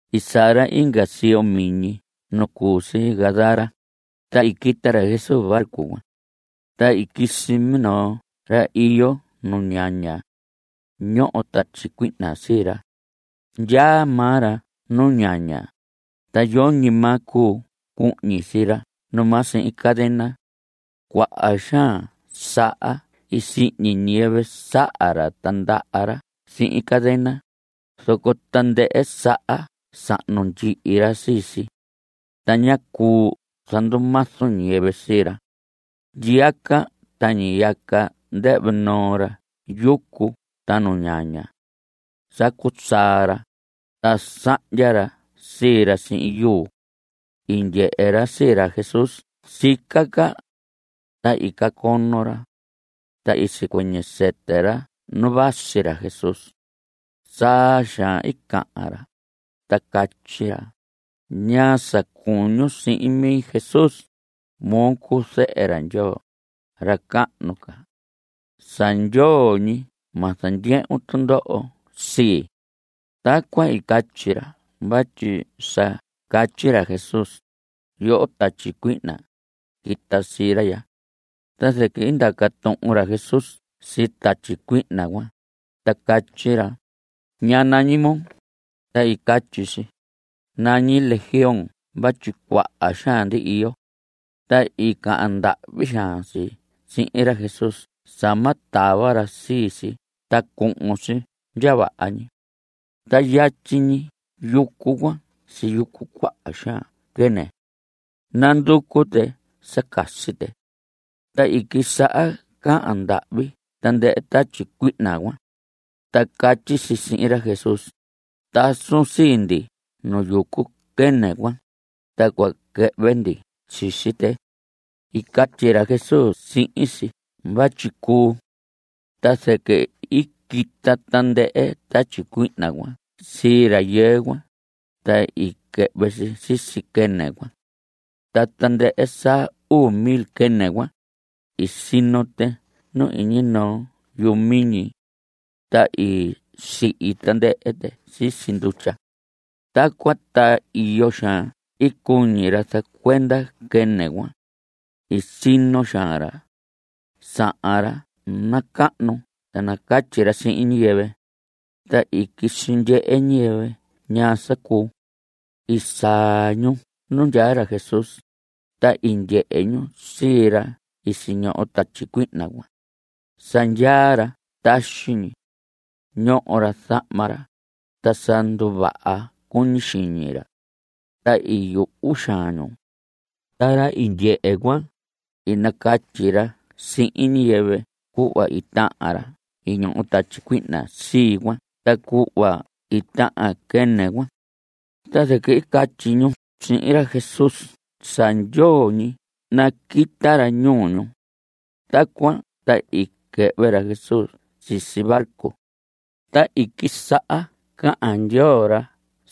I saa ra inga siyo miñi nu cu si Gadara, ta i quita ra Jesús barco cuan. Ta i quisi minoo ra iyo nu ñaña. Ñoho tatyi cuihna sii ra. Ndyaa maa ra nu ñaña, ta yoñi maa cuu cuhñi sii ra numaa sihin cadena. Cuaha xaan saha i sihñi ñiyɨvɨ saha ra ta ndaha ra sihin cadena, zoco tandɨhɨ saha sahnu ndyihi ra sii si. Ta ñá cuu zandumazu ñiyɨvɨ sii ra. Ndyiyaca ta ñiyaca ndɨhvɨ noo ra yucu ta nu ñaña. Sacu saa ra, ta sahndya ra sii ra sihin yuu. I ndyehe ra sii ra Jesús sica ca. Ta i cacono ra. Ta i sicuɨñɨ sɨtɨ ra nu vasi ra Jesús. Saa xaan i cahan ra, ta catyi ra: ¿Ñaa sa cuñun sihin mi, Jesús? Moo cuu zehe ra Ndyoo, ra cahnu ca. Sa ndyoo ñi ma zandyehun tundoho sii. Tacuan i catyi ra vatyi sa catyi ra Jesús: Yoho tatyi cuihna, quita sii ra ya. Ta zɨquɨ i ndaca tuhun ra Jesús sii tatyi cuihna cuan, ta catyi ra: ¿Ñaa nañi moo? Ta i catyi si: Nañi Legión vatyi cuaha xaan ndi iyo. Ta i cahan ndahvi xaan si sihin ra Jesús sa ma tava ra sii si ta cuhun si ndya vaha ñi. Ta yatyi ñi yucu cuan siyucu cuaha xaan quɨnɨ. Nanducu tɨ sa casi tɨ. Ta i quisaha cahan ndahvi tandɨhɨ tatyi cuihna cuan. Ta catyi si sihin ra Jesús: Tasun sii ndi nu yucu quɨnɨ cuan. Ta cua quɨhvɨ ndi sisi tɨ. I catyi ra Jesús sihin si vatyi cuu. Ta zɨquɨ i quita tandɨhɨ tatyi cuihna cuan sii rayɨɨ cuan, ta i quɨhvɨ si sisi quɨnɨ cuan. Ta tandɨhɨ sa uu mil quɨnɨ cuan, i sino tɨ nu iñi noo yuhu miñi. Ta i sihi tandɨhɨ tɨ sisi ndutya. Tacuan ta iyo xaan i cuñi ra zacuenda quɨnɨ cuan. I sino xaan ra. Sahan ra nacahnu sa nacatyi ra sihin ñiyɨvɨ. Ta i quisi ndyehe ñiyɨvɨ ñaa sa cuu. I saa ñu nu ndyaa ra Jesús, ta i ndyehe ñu sii ra i siñoho tatyi cuihna cuan. Sa ndyaa ra taxi ñi. Ñoho ra zahma ra, ta sa nduvaha cuñi xiñi ra. Ta i yuhu xaan ñu. Ta ra i ndyehe cuan, i nacatyi ra sihin ñiyɨvɨ cuhva i tahan ra i ñoho tatyi cuihna sii cuan ta cuhva i tahan quɨnɨ cuan. Ta zɨquɨ i catyi ñu sihin ra Jesús sa ndyoo ñi naquita ra ñuu ñu. Tacuan ta i quɨhvɨ ra Jesús sisi barco. Ta i quisaha cahan ndyoo ra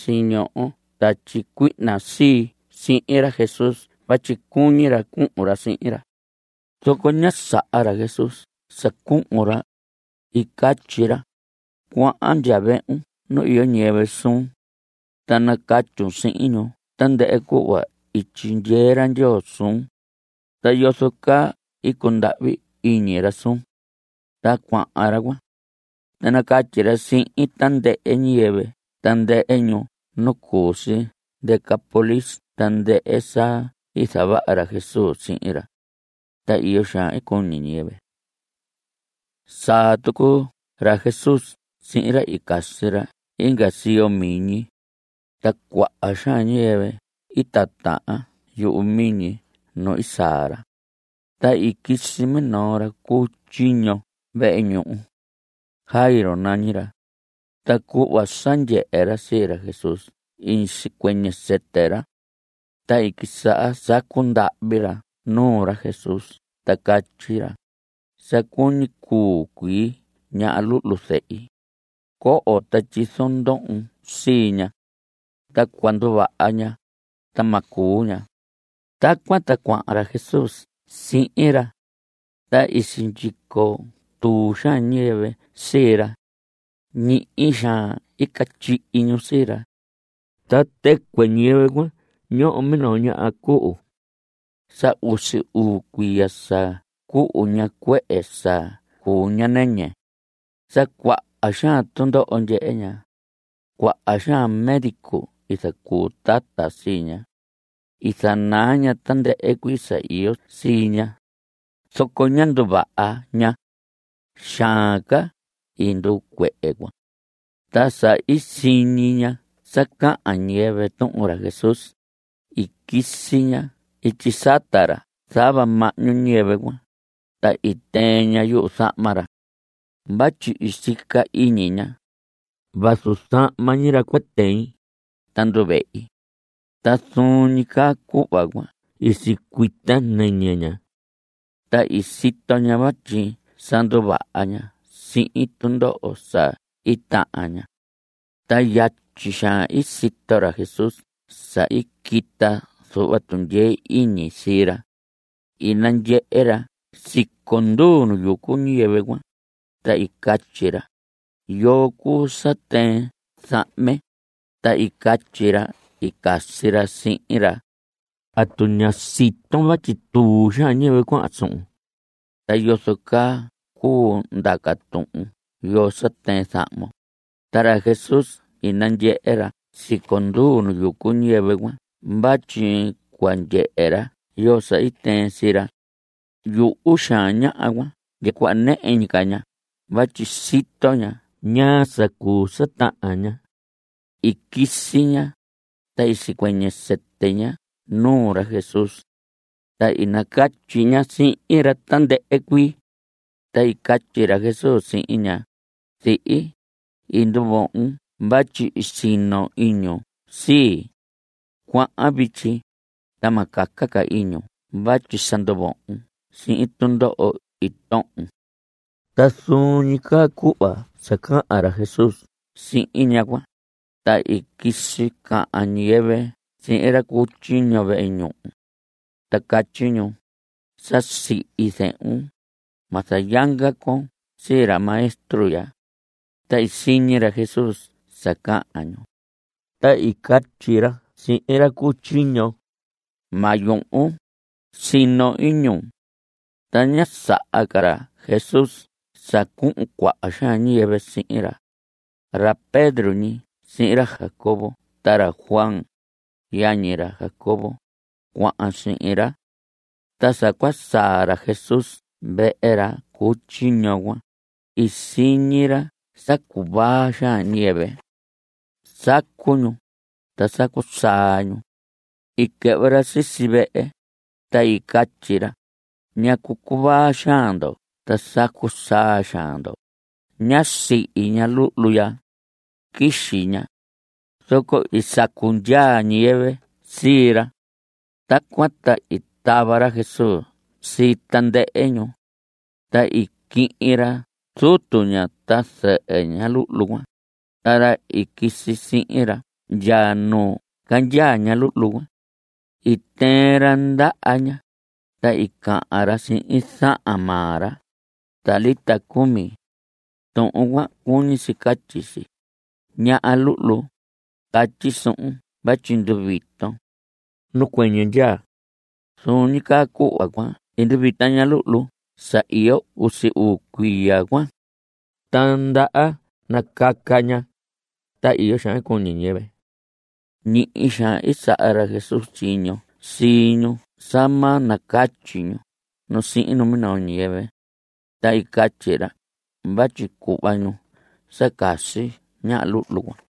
siñoho tatyi cuihna sii cuan sihin ra Jesús vatyi cuñi ra cuhun ra sihin ra. Zoco ñá saha ra Jesús sa cuhun ra. I catyi ra: Cuahan ndya vehun nu iyo ñiyɨvɨ suun. Ta nacatyun sihin ñu tandɨhɨ cuhva i tyindyee ra Ndyoo suun. Ta yozo caa i cundahvi iñi ra suun. Ta cuahan ra cuan. Ta i nacatyi ra sihin tandɨhɨ ñiyɨvɨ tandɨhɨ ñuu nu cu si Decápolis tandɨhɨ sa i zavaha ra Jesús sihin ra. Ta iyo xaan i cuñi ñiyɨvɨ. Saa tucu ra Jesús sihin ra i casi ra inga siyo miñi. Ta cuaha xaan ñiyɨvɨ i titahan yuhu miñi nu i saa ra. Ta i quisi minoo ra cu tyiño vehe ñuhu. Jairo nañi ra. Ta cuhva sa ndyehe ra sii ra Jesús i sicuɨñɨ sɨtɨ ra. Ta i quisaha sacu ndahvi ra nuu ra Jesús ta catyi ra: Sa cuñi cuu cuii ña luhlu zehi. Coho ta tyizon ndohon sii ña. Ta cua nduvaha ña, ta ma cuu ña. Tacuan ta cuahan ra Jesús sihin ra. Ta i sindyico tuu xaan ñiyɨvɨ sii ra. Ñihi xaan i catyihi ñu sii ra. Ta tɨcuɨ ñiyɨvɨ cuan ñoho minoo ñaha cuhu. Sa usi uu cuiya sa cuhu ña cuehe sa cuu ña nɨñɨ. Sa cuaha xaan tundoho ndyehe ña. Cuaha xaan médico i zacuu tata sii ña. I zanaa ña tandɨhɨ cuii sa iyo sii ña. Zoco ñá nduvaha ña. Xaan ca i nduu cuehe cuan. Ta sa i siñi ña sa cahan ñiyɨvɨ tuhun ra Jesús, i quisi ña ityi sata ra zava mahñu ñiyɨvɨ cuan, ta i tɨɨn ña yuzahma ra. Vatyi i sica iñi ña: “Vazu zahma ñi ra cua tɨin, ta nduvehi.” Ta zuun ñi caa cuhva cuan i sicuita nɨñɨ ña. Ta i sito ña vatyi sa nduvaha ña sihin tundoho sa i tahan ña. Ta yatyi xaan i sito ra Jesús sa i quita zuhva tundyee iñi sii ra. I nandyehe ra siconduu nu yucu ñiyɨvɨ cuan. Ta i catyi ra: ¿Yoo cuu sa tɨɨn zahme? Ta i catyi ra i casi ra sihin ra: ¿Atu ña siton vatyi tuu xaan ñiyɨvɨ cuahan suhun? ¿Ta yozo caa cuu ndaca tuhun yoo sa tɨɨn zahmon? Ta ra Jesús i nandyehe ra siconduu nu yucu ñiyɨvɨ cuan vatyi cua ndyehe ra yoo sa i tɨɨn sii ra. Yuhu xaan ñaha cuan ndya cuhva nɨhɨ ñi ca ña vatyi sito ña ñaa sa cuu sa tahan ña. I quisi ña, ta i sicuɨñɨ sɨtɨ ña nuu ra Jesús. Ta i nacatyi ña sihin ra tandɨhɨ cuii. Ta i catyi ra Jesús sihin ña: Zihi, i nduvohon vatyi i sino iñun sii. Cuahan vityi, ta ma caca ca iñun vatyi sa nduvohon sihin tundoho i tohon. Ta zuun ñi caa cuhva sa cahan ra Jesús sihin ñaha cuan, ta i quisi cahan ñiyɨvɨ sihin ra cu tyiño vehe ñuhu. Ta catyi ñu: Sa sihi zehun. Ma zayanga con sii ra Maestro ya. Ta i siñi ra Jesús sa cahan ñu. Ta i catyi ra sihin ra cu tyiño: Ma yuhun. Sino iñun. Ta ñá saha ca ra Jesús sa cuhun cuaha xaan ñiyɨvɨ sihin ra. Ra Pedro ñi sihin ra Jacobo ta ra Juan, yañi ra Jacobo, cuahan sihin ra. Ta sa cua saa ra Jesús vehe ra cu tyiño cuan, i siñi ra sa cuvaa xaan ñiyɨvɨ. Sacu ñu. Ta sacu saa ñu. I quɨhvɨ ra sisi vehe, ta i catyi ra: ¿Ñacu cuvaa xaan ndo ta sacu xaan ndo? Ñá sihi ña luhlu ya. Quixi ña. Zoco i sacu ndyaa ñiyɨvɨ sii ra. Tacuan ta i tava ra Jesús sii tandɨhɨ ñu. Ta i quihin ra zutu ña ta zɨhɨ ña luhlu cuan, ta ra i quisi sihin ra ndya nu candyaa ña luhlu cuan. I tɨɨn ra ndaha ña, ta i cahan ra sihin zahan maa ra: Talita, cumi. Tuhun cuan cuñi si catyi si: Ñaha luhlu, catyi suhun vatyi nduviton. Nacuɨñɨ ndyaa. Zuun ñi caa cuhva cuan i nduvita ña luhlu sa iyo usi uu cuiya cuan. Ta ndaha nacaca ña. Ta iyo xaan i cuñi ñiyɨvɨ. Ñihi xaan i saha ra Jesús tyiño sii ñu sa ma nacatyi ñu nu sihin minoo ñiyɨvɨ. Ta i catyi ra vatyi cuhva ñu sa casi ña luhlu cuan.